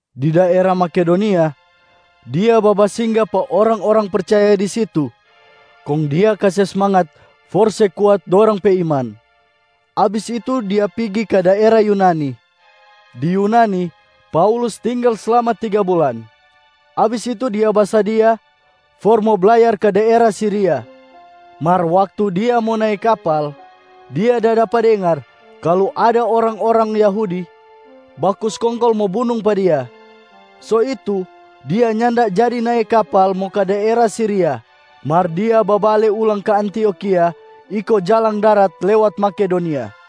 Di daera Makedonia, dia babasingga pa orang-orang percaya di situ kong dia kase smangat for se kuat dorang pe iman. Abis itu, dia pigi ka daera Yunani. Di Yunani Paulus tinggal slama tiga bulan. Abis itu, dia basadia for mo blayar ka daera Siria. Mar waktu dia mo nae kapal, dia da dapa dengar kalu ada orang-orang Yahudi baku skongkol mo bunung pa dia. So itu, dia nyanda jadi nae kapal mo ka daera Siria mar dia babale ulang ka Antiokhia iko jalang darat lewat Makedonia.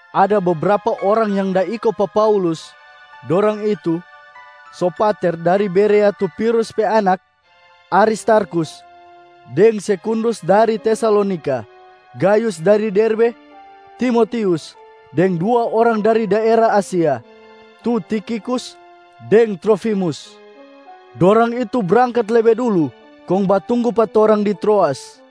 Ada bebrapa orang yang da iko pa Paulus. Dorang itu: Sopater dari Berea tu Pirus pe anak, Aristarkhus deng Sekundus dari Tesalonika, Gayus dari Derbe, Timotius, deng dua orang dari daera Asia, tu Tikhikus deng Trofimus. Dorang itu brangkat lebe dulu kong batunggu pa torang di Troas.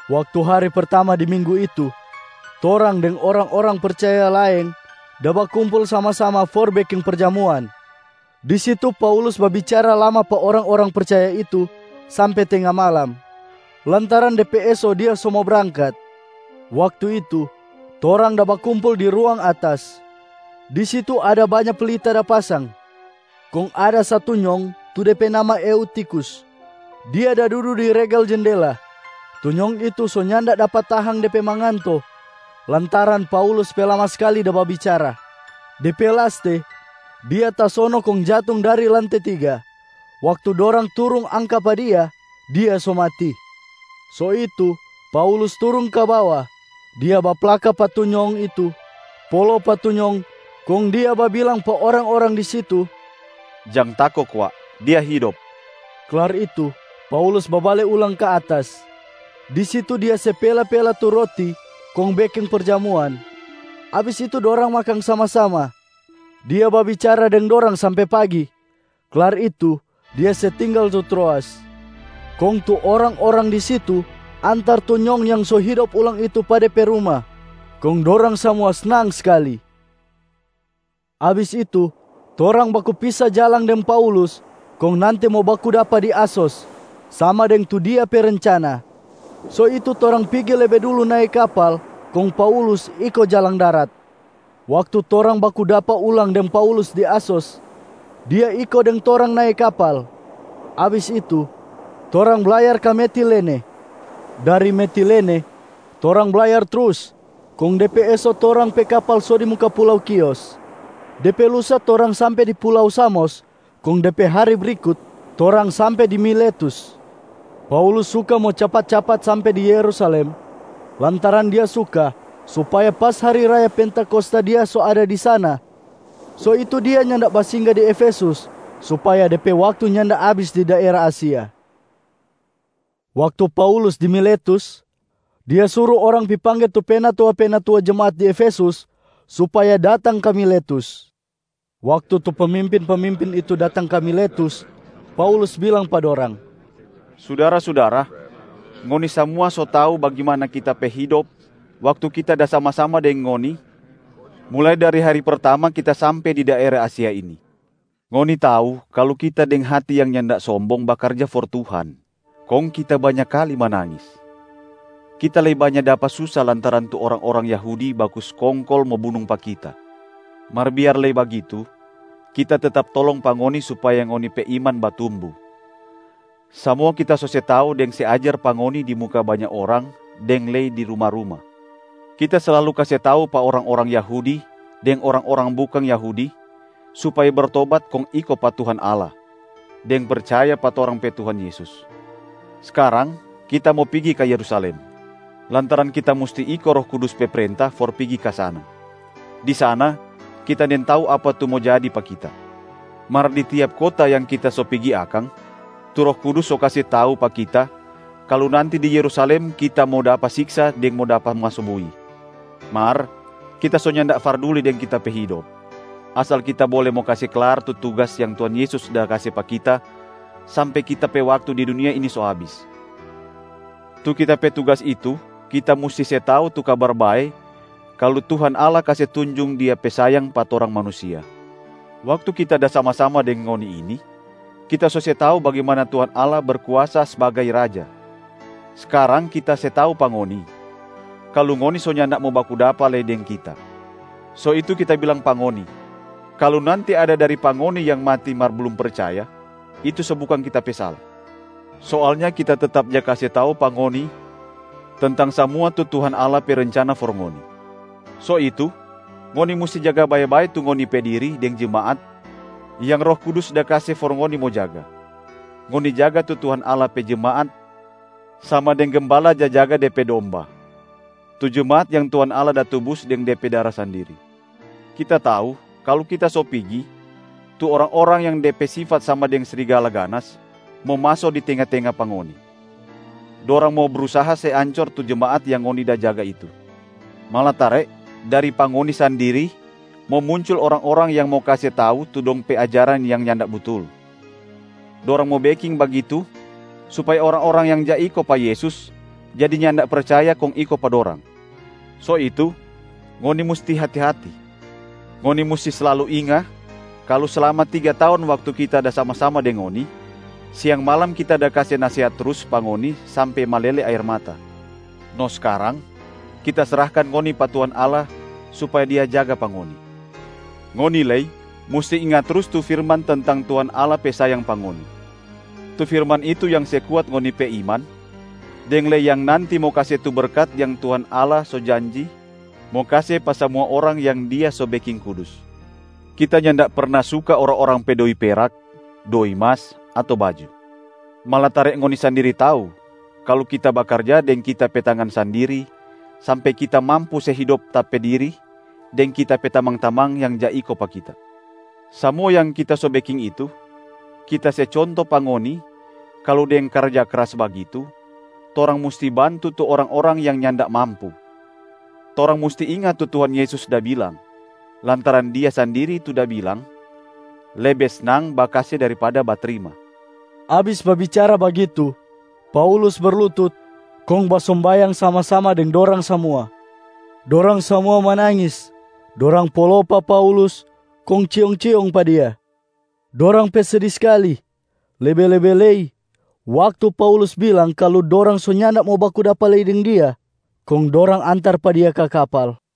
Waktu hari pertama di minggu itu, torang deng orang-orang percaya laeng da bakumpul sama-sama for mo beking perjamuan. Di situ Paulus babicara lama pa orang-orang percaya itu sampe tenga malam, lantaran de pe eso dia so mo brangkat. Waktu itu, torang da bakumpul di ruang atas. Di situ ada banya pelita da pasang. Kong ada satu nyong tu de pe nama Eutikhus, dia da dudu di regel jendela. Tu nyong itu so nyanda dapa tahang de pe manganto lantaran Paulus pe lama skali da babicara. De pe laste, dia tasono kong jatung dari lante tiga. Waktu dorang turung angka pa dia, dia so mati. So itu Paulus turung ka bawa. Dia baplaka pa tu nyong itu, polo pa tu nyong kong dia babilang pa orang-orang di situ, “Jang tako kwa, dia hidop.” Klar itu Paulus babale ulang ka atas. Di situ dia se pela-pela tu roti kong beking perjamuan, abis itu dorang makang sama-sama. Dia babicara deng dorang sampe pagi. Klar itu dia se tinggal tu Troas. Kong tu orang-orang di situ antar tu nyong yang so hidop ulang itu pa de pe ruma, kong dorang samua snang skali. Abis itu, torang baku pisa jalang deng Paulus kong nanti mo baku dapa di Asos sama deng tu dia pe rencana. So itu torang pigi lebe dulu nae kapal, kong Paulus iko jalang darat. Waktu torang baku dapa ulang deng Paulus di Asos, dia iko deng torang nae kapal. Abis itu, torang blayar ka Metilene. Dari Metilene torang blayar trus, kong de pe eso torang pe kapal so di muka pulau Khios. De pe lusa torang sampe di pulau Samos, kong de pe hari brikut torang sampe di Miletus. Paulus suka mo capat-capat sampe di Yerusalem, lantaran dia suka supaya pas hari raya Pentakosta dia so ada di sana. So itu dia nyanda basingga di Efesus supaya de pe waktu nyanda abis di daera Asia. Waktu Paulus di Miletus, dia suru orang pi pangge tu penatua-penatua jemaat di Efesus supaya datang ka Miletus. Waktu tu pemimpin-pemimpin itu datang ka Miletus, Paulus bilang pa dorang, “Sudara-sudara, ngoni samua so tau bagimana kita pe hidop waktu kita da sama-sama deng ngoni mulai dari hari pertama kita sampe di daera Asia ini. Ngoni tau kalu kita deng hati yang nyanda sombong bakarja for Tuhan, kong kita banya kali manangis. Kita lei banya dapa susa lantaran tu orang-orang Yahudi baku skongkol mo bunung pa kita. Mar biar lei bagitu, kita tetap tolong pa ngoni supaya ngoni pe iman batumbu. Samua kita so se tau deng se ajar pa ngoni di muka banya orang deng lei di ruma-ruma. Kita slalu kase tau pa orang-orang Yahudi deng orang-orang bukang Yahudi supaya bertobat kong iko pa Tuhan Allah, deng percaya pa torang pe Tuhan Yesus. Skarang kita mo pigi ka Yerusalem, lantaran kita musti iko Roh Kudus pe prenta for pigi ka sana. Di sana, kita nintau apa tu mo jadi pa kita. Mar di tiap kota yang kita so pigi akang, tu Roh Kudus so kase tau pa kita kalu nanti di Yerusalem kita mo dapa siksa deng mo dapa maso bui. Mar kita so nyanda farduli deng kita pe hidop, asal kita bole mo kase klar tu tugas yang Tuhan Yesus da kase pa kita sampe kita pe waktu di dunia ini so abis. Tu kita pe tugas itu kita musti se tau tu Kabar Bae kalu Tuhan Allah kase tunjung Dia pe sayang pa torang manusia. Waktu kita da sama-sama deng ngoni ini, kita so se tau bagimana Tuhan Allah Berkuasa sbagai Raja. Skarang kita se tau pa ngoni, kalu ngoni so nyanda mo baku dapa lei deng kita. So itu kita bilang pa ngoni, kalu nanti ada dari pa ngoni yang mati mar blum percaya, itu so bukang kita pe sala. Soalnya kita tetap ja kase tau pa ngoni tentang samua tu Tuhan Allah pe rencana for ngoni. So itu, ngoni musti jaga bae-bae tu ngoni pe diri deng jemaat yang Roh Kudus da kase for ngoni mo jaga. Ngoni jaga tu Tuhan Allah pe jemaat sama deng gembala ja jaga de pe domba, tu jemaat yang Tuhan Allah da tubus deng De pe dara sandiri. Kita tau kalu kita so pigi, tu orang-orang yang de pe sifat sama deng srigala ganas mo maso di tenga-tenga pa ngoni. Dorang mo brusaha se ancor tu jemaat yang ngoni da jaga itu. Malatare dari pa ngoni sandiri mo muncul orang-orang yang mo kase tau tu dong pe ajaran yang nyanda butul. Dorang mo beking bagitu supaya orang-orang yang ja iko pa Yesus jadi nyanda percaya kong iko pa dorang. So itu ngoni musti hati-hati. Ngoni musti slalu inga kalu slama tiga taong waktu kita da sama-sama deng ngoni, siang malam kita da kase nasehat trus pa ngoni sampe malele aer mata. No skarang, kita srahkan ngoni pa Tuhan Allah supaya Dia jaga pa ngoni. Ngoni lei musti inga trus tu firman tentang Tuhan Allah pe sayang pa ngoni. Tu firman itu yang se kuat ngoni pe iman, deng lei yang nanti mo kase tu berkat yang Tuhan Allah so janji mo kase pa samua orang yang Dia so beking kudus. Kita nyanda perna suka orang-orang pe doi perak, doi mas ato baju. Malatare ngoni sandiri tau kalu kita bakarja deng kita pe tangan sandiri, sampe kita mampu se hidop ta pe diri deng kita pe tamang-tamang yang ja iko pa kita. Samua yang kita so beking itu, kita se conto pa ngoni kalu deng karja kras bagitu, torang musti bantu tu orang-orang yang nyanda mampu. Torang musti inga tu Tuhan Yesus da bilang, lantaran Dia sandiri tu da bilang, ‘Lebe snang bakase daripada batrima.’” Abis babicara bagitu, Paulus berlutut kong basombayang sama-sama deng dorang samua. Dorang samua manangis, dorang polo pa Paulus kong ciong-ciong pa dia. Dorang pe sedi skali lebe-lebe lei waktu Paulus bilang kalu dorang so nyanda mo baku dapa lei deng dia. Kong dorang antar pa dia ka kapal.